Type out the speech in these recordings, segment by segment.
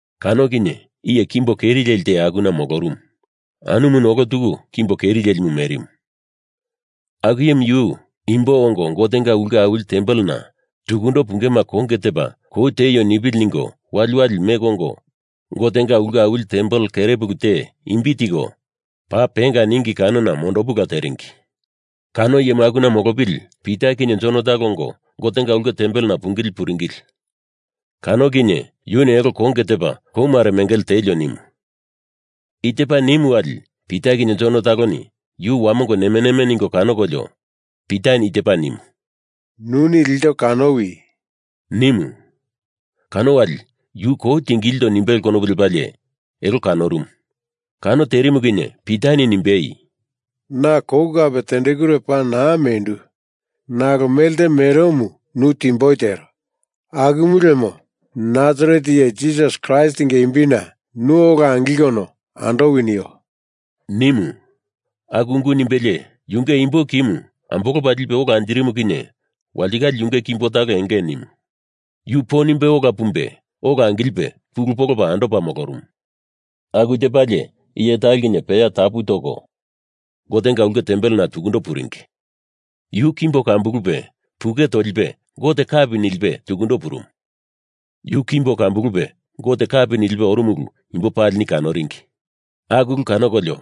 Kano kinye iye kimbo keri leli te akuna molorumu. Anumuni olo tuku kimbo keri lelimu merimu. Aku iyemu yu imbo ongo Gotenga ulke awili tempelena tukundo pungema konge tepa kou tieio nipili ningo waliwali meko ongo Gotenga ulke awili tempel kere pulu te imbi tiko Paa Penga ningi kanona mondopula teringi. Kano iyemu akuna molopili Pita kinye Jon talo ongo Gotenga ulke tempelena pungili puringili. Kano kinye yuni elo konge tepa kou mare mengele tielio nimu. I tepa nimu wali Pita kinye Jon taloni yu wamongo neme neme ningo kanokolio Pitani i tepa nimu, “Nuni ilto kanowi,” nimu. Kano wali yuni kou tingilindo nimbele konopu lepalie elo kanorumu. Kano terimu kinye Pitani nimbei, “Na kou kape tendekure paa naa mendu nalo mele te meromu nu timboi tero. Akumu lemo Nasaret Iye Jisas Kraistinga imbina nu ola angilkono andowi nio,” nimu. Aku ungu nimbelie yunge imbo kimu ambolopa lipe ola anjirimu kinye walitikale yunge kimbo talo enge nimu. Yu po nimbe ola pumbe ola angilipe pulu polopa andopa molorumu. Aku tepalie iye talo kinye peya tapu toko Gotenga ulke tempelena tukundo puringi. Yu kimbo kambulupe puke tolipe Gote kapi nilipe tukundo purumu. Yu kimbo kambulupe Gote kapi nilipe orumu ulu imbo palini kanoringi. Aku ulu kanokolio,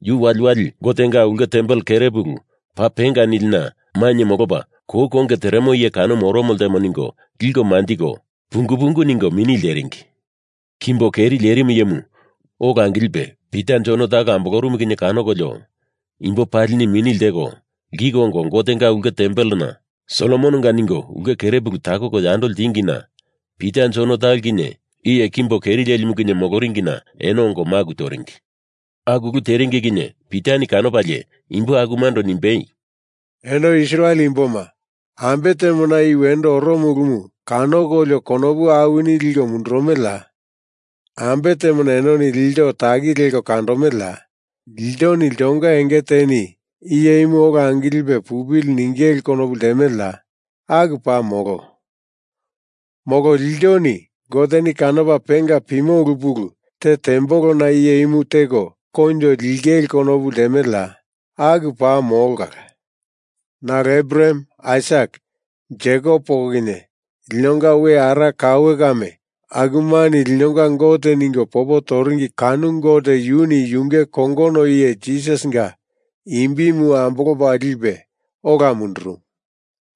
yu waliwali Gotenga ulke tempel kere pulu Paa Penga nilina mainye molopa kou konge teremo iye kanomu oromo ltemo ningo liko manjiko pungu pungu ningo mini lteringi. Kimbo keri lerimu iyemu ola angilipe Pita Jon talo ambolorumu kinye kanokolio imbo palini mini lteko lkiko ongo Gotenga ulke tempelena Solomononga ningo ulke kere pulu takoko yandoko ltingina Pita Jon talo kinye iye kimbo keri lerimumu kinye moloringina eno ongo maku toringi. Aku ulu teringi kinye Pitani kanopalie imbo akumando nimbei, “Eno Israel imboma, ambe temona i wendo oromo ulumu kanokolio konopu awini liko mundurumeleya? Ambe temona enoni ilto taki leko kandomeleya? Iltoni iltonga enge teni iye imu ola angilipe pupili ningele konopu ltemeleya? Aku paa molo. Molo iltoni Goteni kanopa penga pimo ulu pulu te tembolona iye imu teko koinjo lingele konopu ltemeleya? Aku paa molo kala. Nalo Abraham, Aisak, Jekop poko kinye linonga we ara kaue kame akumani linonga Gote ningo popo toringi kano Gote yuni yunge kongono iye Jisasinga imbimu ambolopa lipe ola mundurumu.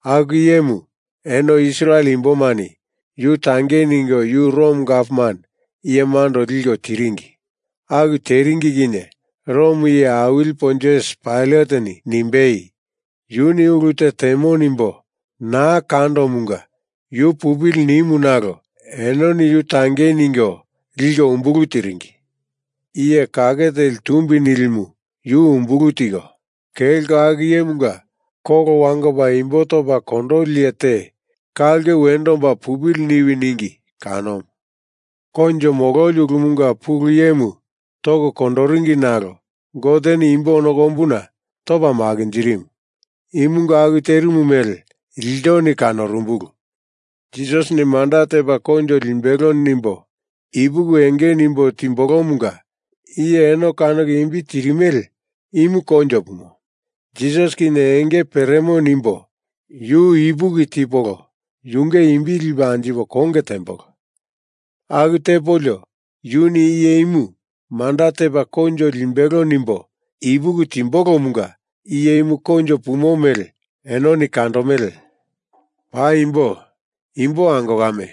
Aku iyemu eno Israel imbomani yu tangei ningo yu Rom Gavman iyemando liko tiringi. Aku teringi kinye Rom iye awili Pontius Pailateni nimbei, Yuni ulu te temo nimbo naa kandomunga yu pupili nimu nalo enoni yu tangei ningo liko umbulu tiringi. Iye kake teli tumbi nilimu yu umbulu tiko, kelko aku iyemunga kolo wangopa imbo topa kondoli iye te ka ulke wendo omba pupili niwi ningi kanomu. Koinjo mololi ulumunga pulu iyemu toko kondoringi nalo Goteni imbo ono kombuna topa makinjirimu. Imunga aku terimu mele iltoni kanorumbulu. Jisasini manda tepa koinjo limbelo nimbo ipuki enge nimbo timbolomunga iye eno kanoko imbi tirimele imu koinjo pumo. Jisas kinye enge peremo nimbo yu ipuki tipolo yunge imbi lipo anjipo konge tembolo. Aku tepolio yuni iye imu manda tepa koinjo limbelo nimbo ipuki timbolomunga iye imu koinjo pumo mele enoni kandomele. Paimbo, imbo ango kame,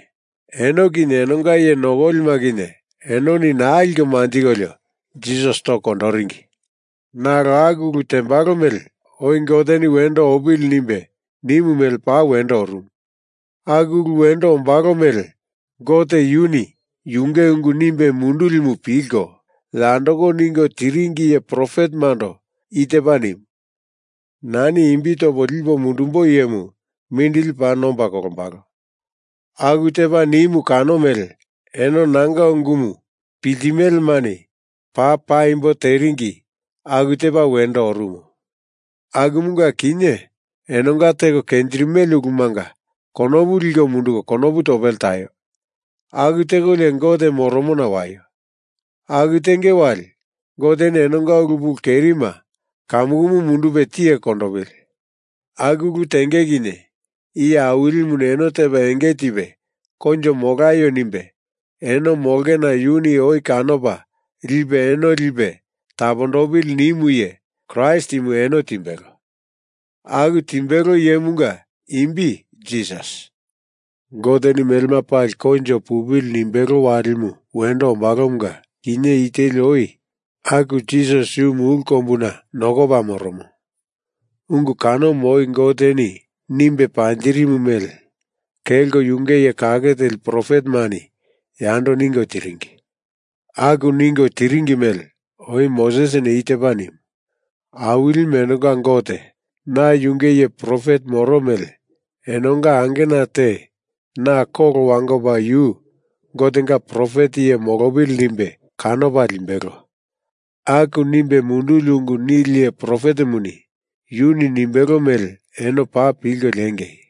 eno kinye enonga iye nokolima kinye enoni naa liko manjikolio Jisas toko kondoringi. Nalo aku ulu tembalo mele oi Goteni wendo opili nimbe nimu mele paa wendo orumu. Aku ulu wendo ombalo mele Gote yuni yunge ungu nimbe mundulimu pilko yandoko ningo tiringi iye profetemando i tepa nimu: Nani imbi topo lipo mundumbo iyemu mindili paa nomba kolombalo. Aku tepa nimu kano mele eno nanga ungumu piltimelemani paa paimbo teringi aku tepa wendo orumu. Akumunga kinye enonga teko kenjirimele ulumanga konopu liko munduko konopu topele taio. Aku tekolio Gote moromona waio. Aku tenge wali Goteni enonga ulu pulu kerima kamukumu mundupe tiye kondopili. Aku ulu tenge kinye Iye Awilimuni eno tepa enge tipe koinjo molaio nimbe eno molongena yuni oi kanopa lipe eno lipe tapondopili nimu iye Kraist imu eno timbelo. Aku timbelo iyemunga imbi Jisas. Goteni melema pali koinjo pupili nimbelo walimu wendo ombalomunga kinye i teli oi aku Jisas yu mulu kombuna nokopa moromo. Ungu kanomu oi Goteni nimbe panjirimu mele kelko yunge iye kake teli profetemani yando ningo tiringi. Aku ningo tiringi mele, oi Mosesini i tepa nimu, Awilimu enonga Gote na yunge iye profet moro mele enonga angena te na kolo wangopa yu Gotenga profet iye molopili nimbe kanopa limbelo. Aku nimbe munduli ungu nili iye profetemu yuni nimbelo mele eno paa pilko lengei.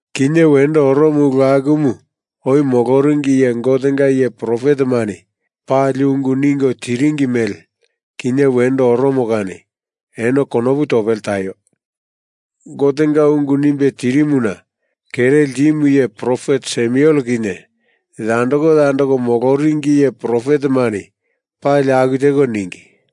Kinye wendo oromo ulu akumu oi moloringi iye Gotenga iye profetemani pali ungu ningo tiringi mele kinye wendo oromo kani eno konopu topele taio. Gotenga ungu nimbe tirimuna kere ltimu iye profet Samuel kinye yandoko yandoko moloringi iye profetemani pali aku teko ningi.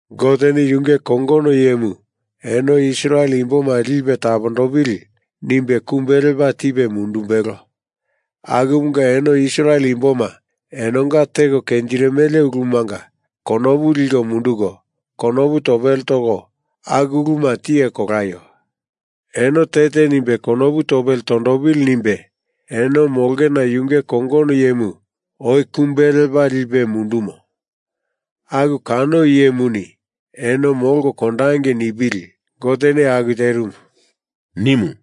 Goteni yunge kongono iyemu eno Israel imboma lipe tapondopili nimbe kumbe lepa tipe mundumbelo. Akumunga Eno Israel imboma enonga teko kenjirimele ulumanga konopu liko munduko konopu topele toko aku uluma tiye kolaio. Eno te te nimbe konopu topele tondopili nimbe eno molongena yunge kongono iyemu oi kumbe lepa lipe mundumo. Aku kano iyemuni eno molko kandangei nipili Goteni aku terimu,” nimu.